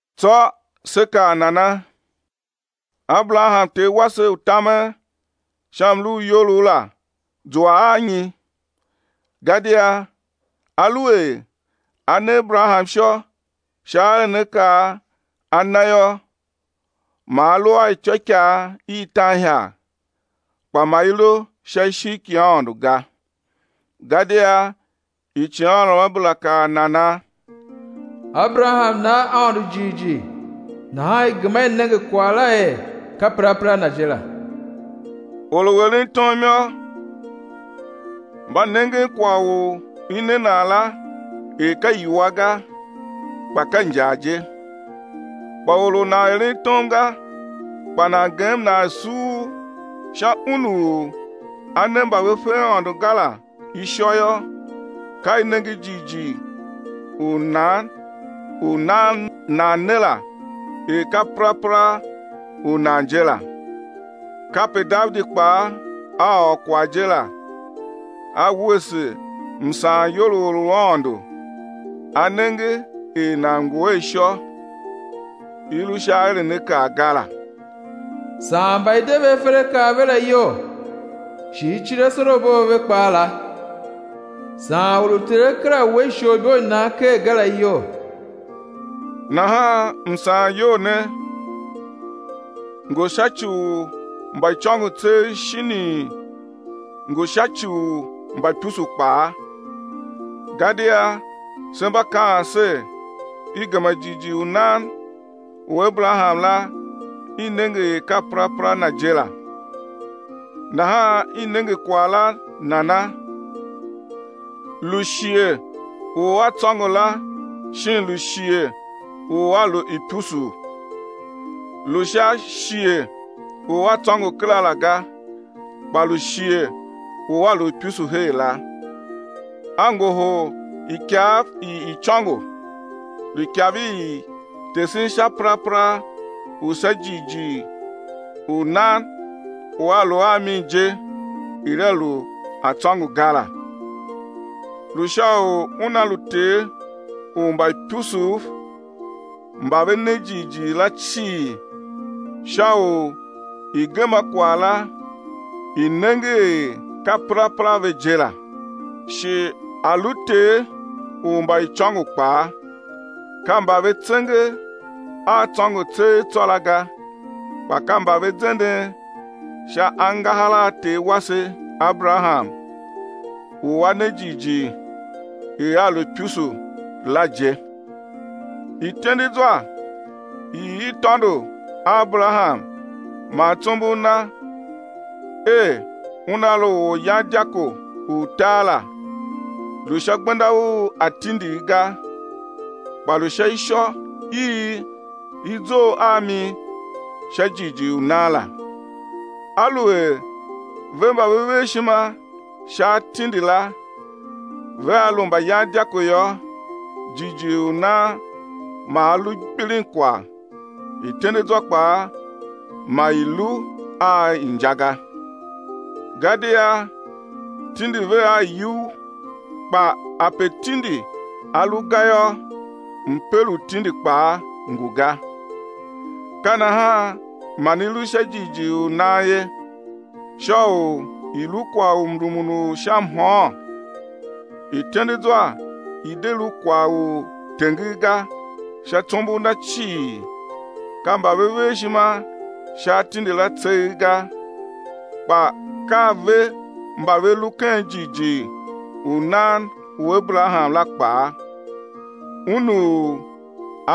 Tsô sé kaa nana? Aberaham ter wase u tamen sha mlu u iyolough la, zua a nyi? Gadia aluer a ne Aberaham ishô sha aerenakaa a na yô, ma a lu a ityôikaa i tan ihagh, kpa ma i lu sha ishigh ki Aôndo ga. Gadia icighanruamabera kaa nana? Aberaham na Aôndo jighjigh nahan i gema i nenge kwagh la er ka perapera na je la. Or u eren tom yô, mba nengen kwagh u i ne nan la er ka iwua ga, kpa ka injar je. Kpa or u nan eren tom ga, kpa nan gem nan suur sha Un u A ne mba ve fe Aôndo ga la ishô yô, ka i nenge jighjigh u nan u nan ne la er ka perapera u nan je la. Kape Davidi kpaa a ôr kwagh je la, a wuese msaanyol u or u Aôndo A nenge er nan ngu a ishô, i lu sha aerenakaa ga la. Saan mba i de ve aferakaa a ve la iyol, shi i cir asorabo a ve kpaa la. Saan or u Ter A kera we isholibo i nan ker ga la iyol. Nahan msaanyol ne ngu sha ci u mbaicôngo tseegh shinii, ngu sha ci u mbaipusu kpaa? Gadia se mba kaan ser, i gema jighjigh u nan u Aberaham la i nenge er ka perapera na je la. Nahan i nenge kwagh la nana? Lu shighe u a tsôngo la shin lu shighe u a lu ipusuu? Lu sha shighe u a tsôngo kera la ga, kpa lu shighe u a lu ipusu her la. A ngohol ikav i icôngo, lu ikav i tesen sha perapera u sha jighjigh u nan u a lu a mi je er a lu a tsôngo ga la. Lu sha u una lu ter u mbaipusuv mba ve ne jighjigh la cii, sha u i̱ gema kwagh la i̱ nenge er ka perapera ve je la. Shi a̱ lu ter u mbaicôngo kpaa, ka mba ve tsenge a tsôngo tseegh tsô la ga kpa ka mba ve zenden sha angahar a ter wase Aberaham u a ne jighjigh er a lu ipusu la je. Ityendezwa i i tôndo a Aberaham man tsombor na er una lu oryandyako u tar la, lu sha gbenda u atindigh ga, kpa lu sha ishô i i zough a mi sha jighjigh u nan la. Aluer ve mba ve ver ishima sha atindi la vea lu mbayandyako yô, jighjigh u nan ma a lu gbilinkwagh, ityendezwa kpaa ma i lu a inja ga. Gadia tindi ve a iyugh kpa ape tindi a lu ga yô, mper u tindi kpaa ngu ga. Ka nahan man i lu sha jighjigh u nan ye, sha u i̱ lu kwagh u mrumun u sha mhôôn, ityendezwa i̱ de lu kwagh u tenger ga sha tsombor na cii, ka mba ve ver ishima sha atindi la tseegh ga, kpa ka ve mba ve lu ken jighjigh u nan u Aberaham la kpaa, un u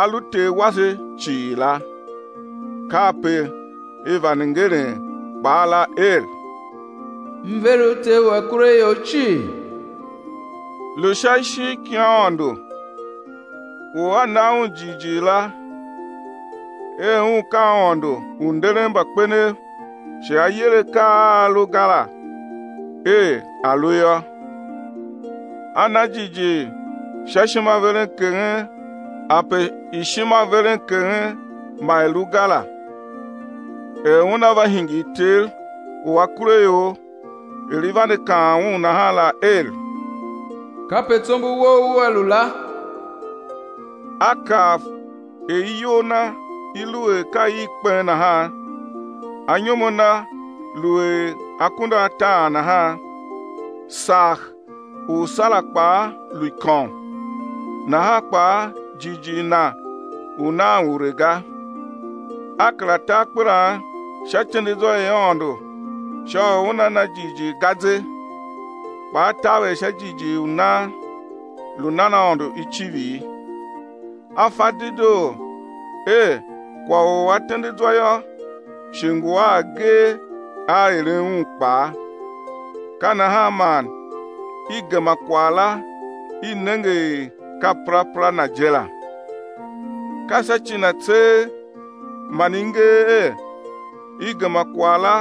a lu ter wase cii la. Kape i vande ngeren kpaa la er, M ver u ter u akuraior cii. Lu sha ishigh ki Aôndo u a na Un jighjigh la er Un ka Aôndo u nderen mbakpenev shi A yer akaa a a lu ga la er a̱ lu yô. A na jighjigh sha ishimaverenkeghen ape ishimaverenkeghen ma i lu ga la, er una va hingir ter u akuraior er i vande kaan un nahan la er: Kape tsombor wou ua lu la. A kav er iyol na i lu er ka i kpen nahan, anyom a na lu er akunduataan nahan, sagh u Sara kpaa lu ikôm, nahan kpaa jighjigh na u nan ure ga. A kera ta akpelan sha ityendezwa i Aôndo sha u una na jighjigh ga ze, kpa a taver sha jighjigh u nan, lu nan Aôndo icivir. A fa dedoo er kwagh u A tende zwa yô, shi ngu a agee a eren un kpaa. Ka nahan man i gema kwagh la i nenge er ka perapera na je la. Ka sha ci na tseegh man i nger er, i gema kwagh la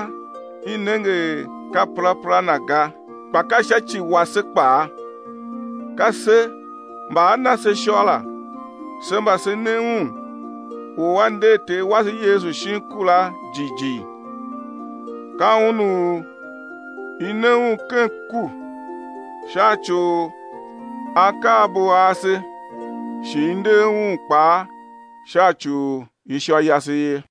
i nenge er ka perapera na ga, kpa ka sha ci wase kpaa, ka se mba á na se ishô la, se mba se ne Un u A nder Ter wase Yesu shin ku la jighjigh. Ka Un u i ne Un ken ku sha ci u akaabo ase shi i nder Un kpaa sha ci u ishô yase ye.